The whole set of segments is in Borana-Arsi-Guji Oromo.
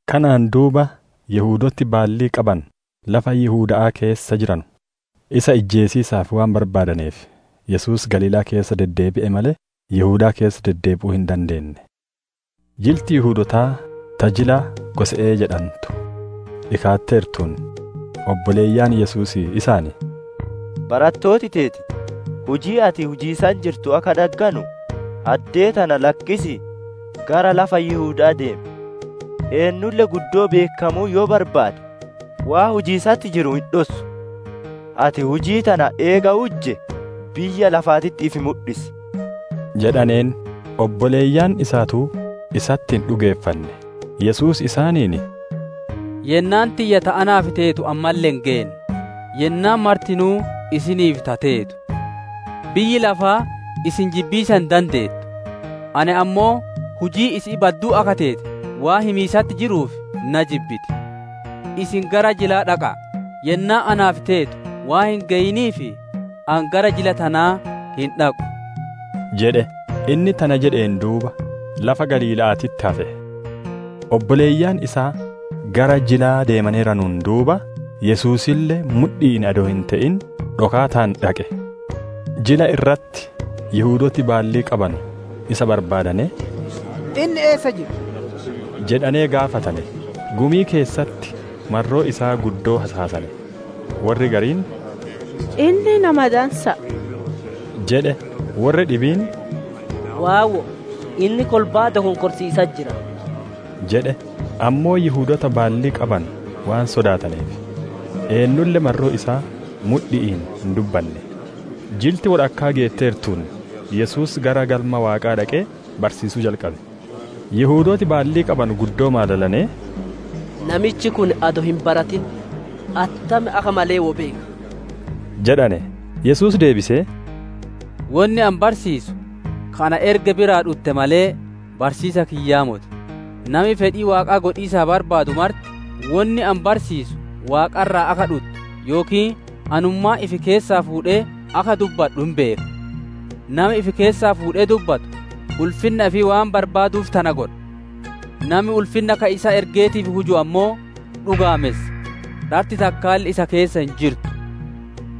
Kanaan duuba, Yihudooti baallii qabanu lafa Yihuda'aa keessa jiranu, isa ijjeesiisaaf waan barbaadaneef, Yesuus Galiilaa keessa deddeebi'e malee, Yihudaa keessa deddeebi'uu hin barbaanne. Jilti Yihudootaa ta jila Gose'ee jedhantu dhikaatteertuun, obboleeyyan Yesuusii isaan, «Barattooti teeti hujii ati hujiisatti jirtu akka dhagganu, addee tana lakkisii gara lafa Yihuda'aa deemi. Eennulle guddoo beekkamuu yoo barbaade, waan hujatiisatti jiru hin dhossu. Ati hujii tana eega hujjee, biyya lafaatitti ifi mudhisi» jedhaneen. Obboleeyyan isaatuu isatti hin dhugeeffanne. Yesuus isaaniin, «Yennaan tiyya ta anaaf teetu ammalle hin geenne. Yennaan martinuu isiniif ta teetu. Biyyi lafaa isin jibbiisa hin dandeettu; ani ammoo hujiin isi'ii badduu akka teete waan himiisatti jiruuf na jibbiti. Isin gara jilaa dhaqa'a. Yennaan naaf teetu waan hin geyiniif, ani gara jila tanaa hin dhaqu» jedhe. Inni tana jedheen duuba lafa Galiila'aatitti hafe. Obboleeyyan isaa gara jilaa deemaneeranuun duuba, Yesuusille mudhi'iin adoo hin te'in dhokaataan dhaqe. Jila irratti Yihudooti baallii qabanu isa barbaadanee, «Inni eessa jira?» jedhanee gaafatane. Gumii keessatti marroo isaa guddoo hasaasane. Worri gariin, «Inni nama dansa'a» jedhe. Worri dhibiin, «Waawwo'o, inni kolbaa dokonkorsiisatti jira» jedhe. Ammoo Yihudoota baallii qabanu waan sodaataneef, eennulle marroo isaa mudhi'iin hin dubbanne. Jilti wodhakkaa geetteertuun, Yesuus gara Galma Waaqaa dhaqee barsiisuu jalqabe. Yihudooti baallii qabanu guddoo maalalanee, «Namichi kun adoo hin baratin attam akka malee wo beeka?» jedhane. Yesuus deebisee, «Wonni ani barsiisu ka na erge biraa dhutte malee, barsiisa kiyyaa moti. Nami fedhii Waaqaa godhiisa barbaadu marti, wonni ani barsiisu Waaqa irraa akka dhutte yookiin anummaan ifi keessaa fuudhee akka dubbadhu hin beeka. Nami ifi keessaa fuudhee dubbatu, ulfinna ifii waan barbaaduuf tana godha. Nami ulfinna ka isa ergeetiif huju ammoo dhugaamessa; dharti takkaalle isa keessa hin jirtu.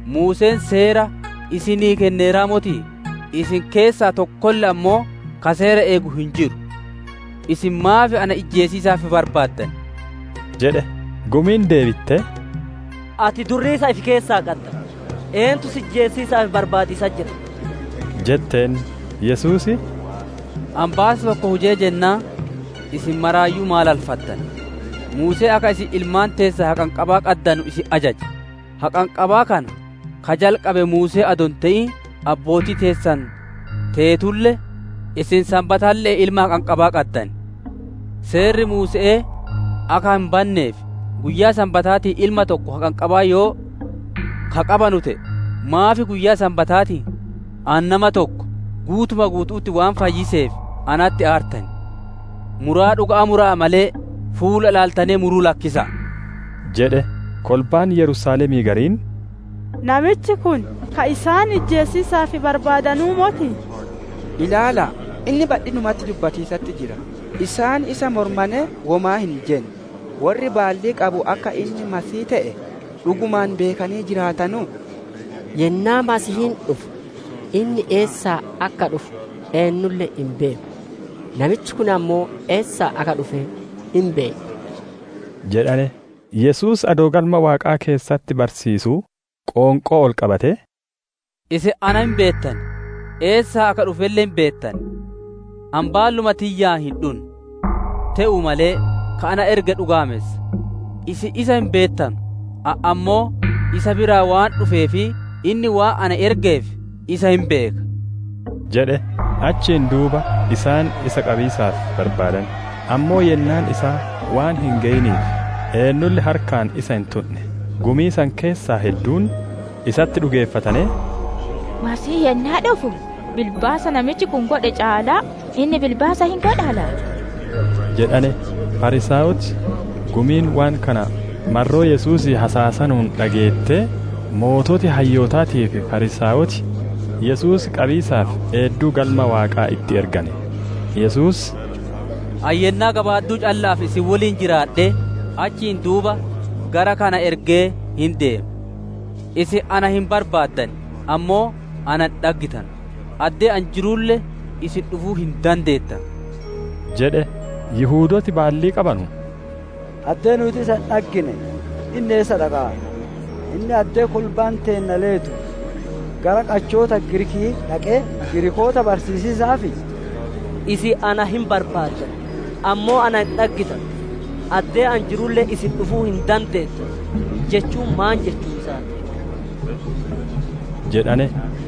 Muuseen seera isinii kenneeraa motii? Isin keessaa tokkolle ammoo ka seera eegu hin jiru. Isin maaf na ijjeesiisaaf barbaaddan?» jedhe. Gumiin deebittee, «Ati durriisa ifi keessaa qadda! Eentu si ijjeesiisaaf barbaadiisatti jira?» jetteen. Yesuus, «Ani baasa tokko hujee jennaan, isin maraayyuu maalalfattane. Muuseen akka isin ilmaan teessan haqanqabaa qaddanu isin ajaje; haqanqabaa kana ka jalqabe Muusee adoo hin te'in abbootii teessan teetulle, isin Sanbatalle'een ilma haqanqabaa qaddan. Seerri Muuse'ee akka hin banneef, guyyaa Sanbataatiin ilma tokko haqanqabaa yoo ka qabanu te'e, maaf guyyaa Sanbataatiin ani nama tokko guutuma guutu'utti waan fayyiseef natti aartan? Muraa dhuga'aa mura'a malee, fuula ilaaltanee muruu lakkisa'a» jedhe. Kolbaan Yerusaalemii gariin, «Namichi kun ka isaan ijjeesiisaaf barbaadanuu motii? Ilaala'a! Inni badhinumatti dubbatiisatti jira; isaan isa mormanee womaa hin jenne! Worri baallii qabu akka inni Masiihii te'e dhugumaan beekanee jiraatanuu? Yennaa Masiihiin dhufu, inni eessaa akka dhufu eennulle hin beeku. Namichi kun ammoo eessaa akka dhufe hin beenna» jedhane. Yesuus adoo Galma Waaqaa keessatti barsiisuu qoonqoo ol qabatee, «Isin ana hin beettan; eessaa akka dhufelle hin beettan. Ani baalluma tiyyaan hin dhunne. Te'uu malee, ka na erge dhugaamessa. Isin isa hin beettanu; ani ammoo isa biraa waan dhufee fi inni waan na ergeef isa hin beeka» jedhe. Achiin duuba isaan isa qabiisaaf barbaadane; ammoo yennaan isaa waan hin geyiniif eennulle harkaan isa hin tundhe. Gumii san keessaa hedduun isatti dhugeeffatanee, «Masiihiin yennaa dhufu, bilbaasa namichi kun godhe caalaa inni bilbaasa hin godhaa laati?» jedhane. Fariisaayoti gumiin waan kana marroo Yesuusii hasaasanuun dhageettee, sooreyyiin hayyootaatii fi Fariisaayoti Yesuus qabiisaaf eedduu Galma Waaqaa itti ergane. Yesuus, «Ani yennaa gabaadduu calla'aaf isin woliin jiraadhee, achiin duuba gara ka na ergee hin deema. Isin na hin barbaaddan; ammoo na hin dhaggittanu; addee ani jirulle, isin dhufuu hin dandeettanu» jedhe. Yihudooti baallii qabanu, «Addee nuuti isa hin dhaggine inni eessa dhaqaara? Inni addee kolbaan teenna leetu gara qachoota Giriiki'ii dhaqee, Giriikoota barsiisiisaafii? ‹Isin na hin barbaaddan; ammoo na hin dhaggittanu; addee ani jirulle, isin dhufuu hin dandeettanu› jechuun maan jechuu isaa ti?» jedhane.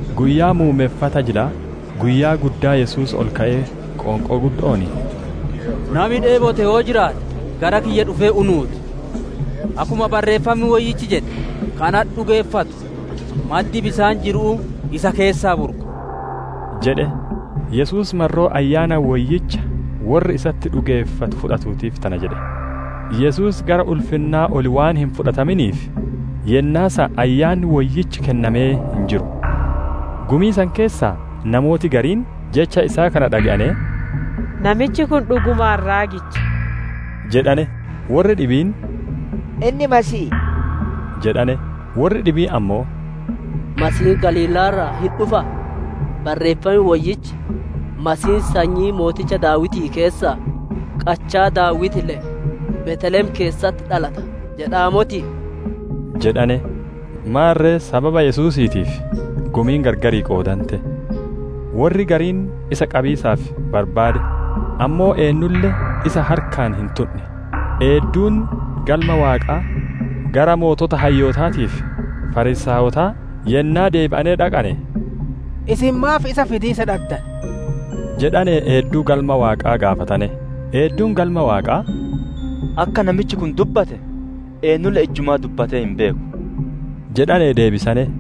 Guyyaa muummeffata jilaa, guyyaa guddaa Yesuus ol ka'ee qoonqoo guddo'oon, «Nami dheebote yoo jiraate gara kiyya dhufee unuu ti. Akkuma barrreeffam Woyyichi jedhe, ‹Ka natti dhugeeffatu, maddi bisaan jiru'uu isa keessaa burqa›» jedhe. Yesuus marroo Ayyaana Woyyicha worri isatti dhugeeffatu fudhatuutiif tana jedhe; Yesuus gara ulfinnaa ol waan hin fudhataminiif, yennaa san Ayyaanni Woyyichi kennamee hin jiru. Gumii san keessaa namooti gariin jecha isaa kana dhage'anee, «Namichi kun dhugumaan raagicha» jedhane. Worri dhibiin, «Inni Masiihii» jedhane. Worri dhibiin ammoo, «Masiihiin Galiilaa irraa hin dhufaa? Barreeffam Woyyichi, Masiihiin sanyii mooticha Daawitii keessaa, qachaa Daawiti le'e, Beeteelem keessatti dhalata jedhaa motii?» jedhane. Maarre sababa Yesuusiitiif gumiin gargar qoodante. Worri gariin isa qabiisaaf barbaade, ammoo eennulle isa harkaan hin tundhe. Eedduun Galma Waaqaa gara sooreyyii hayyootaatii fi Fariisaayota yennaa deebi'anee dhaqane, «Isin maaf isa fidiisa dhaddane?» jedhanee eedduu Galma Waaqaa gaafatane. Eedduun Galma Waaqaa, «Akka namichi kun dubbate eennulle ijjumaa dubbattee hin beeku» jedhanee deebisane.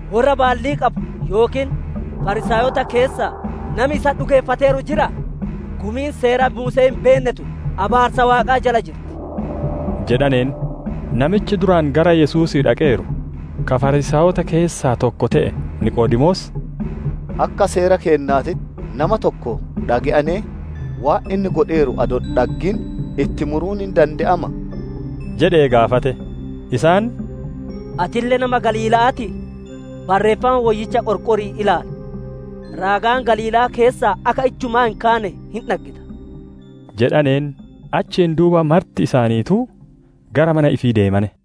Worra baallii qabu yookiin Fariisaayota keessaa nami isatti dhugeeffateeru jiraa? Gumiin seera Muuse'ee hin beenne tun, abaarsa Waaqaa jala jirti!» jedhaneen. Namichi duraan gara Yesuusii dhaqeeru, ka Fariisaayota keessaa tokko te'e Niqoodemoos, «Akka seera keennaatitti nama tokko dhage'anee waan inni godheeru adoo hin dhaggin itti muruun hin dande'amaa?» jedhee gaafate. Isaan, «Atille nama Galiila'aatii? Barreeffama Woyyicha qorqorii ilaali; raagaan Galiilaa keessaa akka ijjumaa hin kaane hin dhaggita» jedhaneen. [ Achiin duuba marti isaaniituu gara mana ifii deemane.